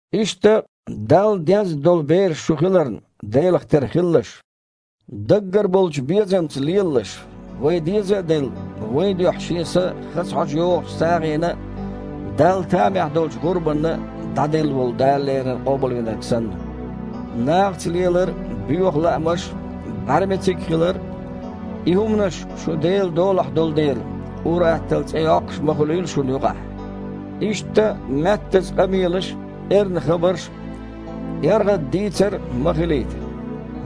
Иштта, Далла дезна долу бераш шу хиларна, Делах тера хилалаш. Даггара болчу безамца лелалаш, вай деза а делла, вайн дуьхьа Шен са хаза хьожа йогІучу сагІина а, Далла тамехь долчу гІурбанна а дІаделла волу Дала леррина Къобалвинарг санна. Нахаца лелар а, боьха лаамаш а, бІаьрмециг хилар а – и хІуманаш, шу Делан долахь долу дела, ур-атталла цІе йоккхуш а ма хуьлийла шуна юкъахь. Иштта маьттаза къамелаш а, эрна хабарш а, эргІада дийцар а ма хилийта.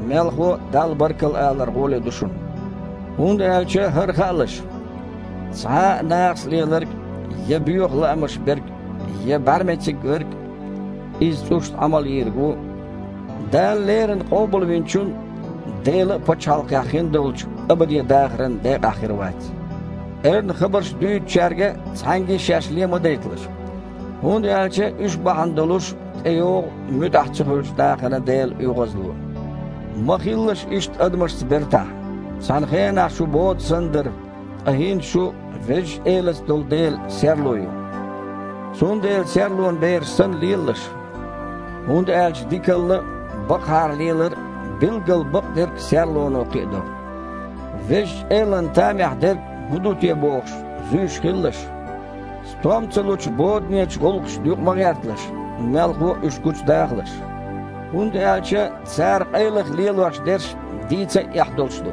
Мелхо а, Далла баркалла алар гІоле ду шуна. ХІунда аьлча хІара хаалаш: цхьа а нахаца леларг, я боьха лаамаш берг, я бІаьрмециг верг (иза цІушна Іамал йийриг ву) Дала леррина Къобалвинчун а, Делан а пачхьалкхехь хиндолчу абаде дахаран декъахь хир вац. Эрна хабарш дуьйцучаьрга цхьаьнгге а шаьш ле ма дайталаш, хІунда аьлча уьш бахьана долуш тІейогІу муьтІахь ца хуьлучу нахана Делан оьгІазло. Ма хилалаш ишттачу адамашца бертахь. Цхьана хенахь шу бода санна дара, ткъа хІинца шу, Везачу Элаца долу дела, серло ю. Цундела, серлонан бераш санна, лелалаш. ХІунда аьлча дикалла а, бакъахьара лелар а, билггал бакъдерг а серлоно кхиадо. Везачу Элана тамехь дерг хІун ду те бохуш, зуьйш хилалаш. Стом ца лучу боданечу гІуллакхашна юкъа ма гІерталаш, мелхо а, уьш гучудахалаш. ХІунда аьлча цара къайлаха лелош дерш дийца а эхь долуш ду.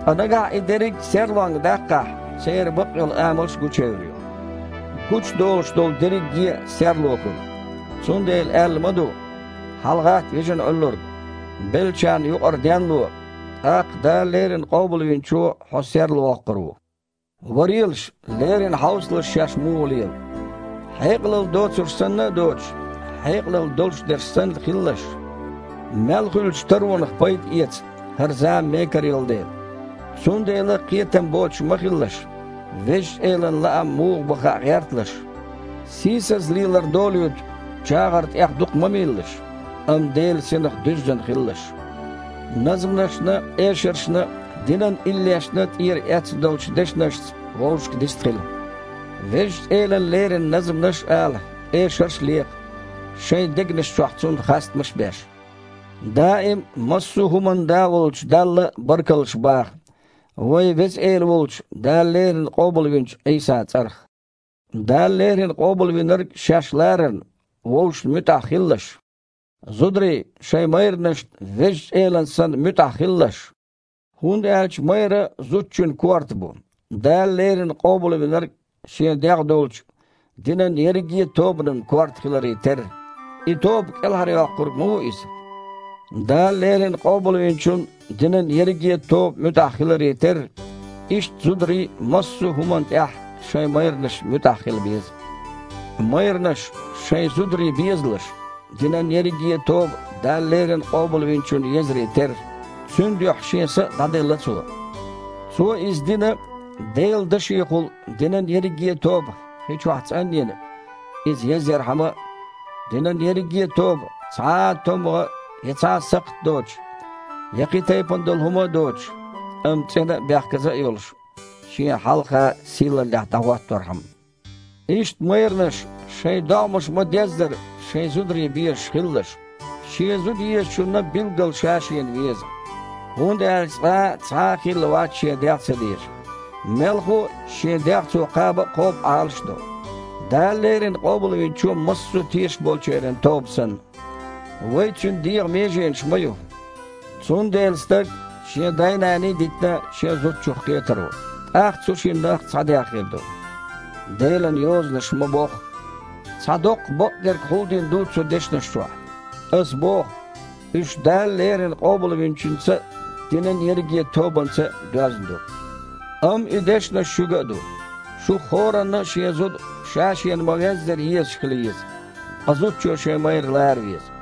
Ткъа нагахь и дерриг а серлонга даккхахь, церан бакъйолу амалш гучуевр ю. Гучудолуш долу дерриге а серло хуьлу. Цундела аьлла ма ду: «ХьалагІатта, вижина Іуьллург, беллачарна юкъара денло, тІаккха Дала леррина Къобалвинчо хьо серлавоккхур ву». Варелаш, леррина хьовсалаш шаьш муха лела. Хьекъалалла доцурш санна а доцуш, хьекъалалла долуш дерш санна хилалаш. Мел хуьлучу таронах пайда эца, хІара зама мекара йолу дела. Цундела кхетам боцуш ма хилалаш. Везачу Элан лаам муха бу хаа гІерталаш. Сийсаза лелар долуьйту чагІар тІех дукха ма мийлалаш, амма Делан Синах дуьззина хилалаш. Назманашна а, эшаршна а, динан иллешна а тІера эцна долчу дешнашца вовшашка дистхила. Везачу Элана лерина назманаш а ала, эшарш а лекха, шайн дегнаш чохь Цунна хастамаш а беш. Даим а, массо а хІуманна а Да волчу Далла баркаллаш баха, вайн Веза Эла волчу, Дала леррина Къобалвинчу Іийсан цІарах. Дала леррина Къобалвинарг шаьш ларарна, вовшашна муьтІахь хилалаш. Зударий, шайн майранашна, Везачу Элана санна, муьтІахь хилалаш. ХІунда аьлча майра зудчун корта бу, Дала леррина Къобалвинарг Шен дегІ долчу динан ерриге а тобанан корта хиларе терра. И тоба КІелхьарйоккхург ма ву Иза. Дала леррина Къобалвинчунна динан ерриге а тоба муьтІахь хиларе терра, иштта зударий а массо а хІуманна тІехь шайн майранашна муьтІахь хила беза. Майранаш, шайн зударий безалаш, динан ерриге а тоба Дала леррина Къобалвинчунна езаре терра. Цуьнан дуьхьа Шен са а дІаделла Цо. Цо иза дина, Делан дашехула динан ерриге а тоба, хи чохь цІан а йина, иза язъярхьама а, динан ерриге а тоба цхьа а томмагІа, я цхьа а сакхт доцуш, я кхин тайпана долу хІума а доцуш, амма цІена а, бехказа а йолуш, Шена хьалха сийлаллехь дІахІотторхьама. Иштта, майранаш, шайн догІмаш ма-деззара, шайн зударий безаш хилалаш. Шен зуда езачунна билггал ша-шена веза. ХІунда аьлча цкъа а цхьа а хилла вац шен дегІ ца дезаш. Мелхо а, шен дегІ цо кхаба а кхобу, Іалаш а до, Дала леррина Къобалвинчо массо а тешаш болчеран тоба санна. Вай Цуьнан дегІан меженаш ма ю. «Цундела стаг, шен да а, нана а дитина, шен зудчух кхетар ву. ТІаккха цу шиннах цхьа дегІ хир ду», – Делан Йозанаша ма-бохху. Цхьа доккха бакъдерг хьулдина ду цу дешнаш чохь. Аса боху, уьш Дала леррина Къобалвинчуьнца а, динан ерриге а тобанца а доьзна ду. Амма и дешнаш шуьга а ду: шух хІоранна а шен зуда, ша-шена ма-веззара, езаш хила еза, ткъа зудчо шен майра лара веза.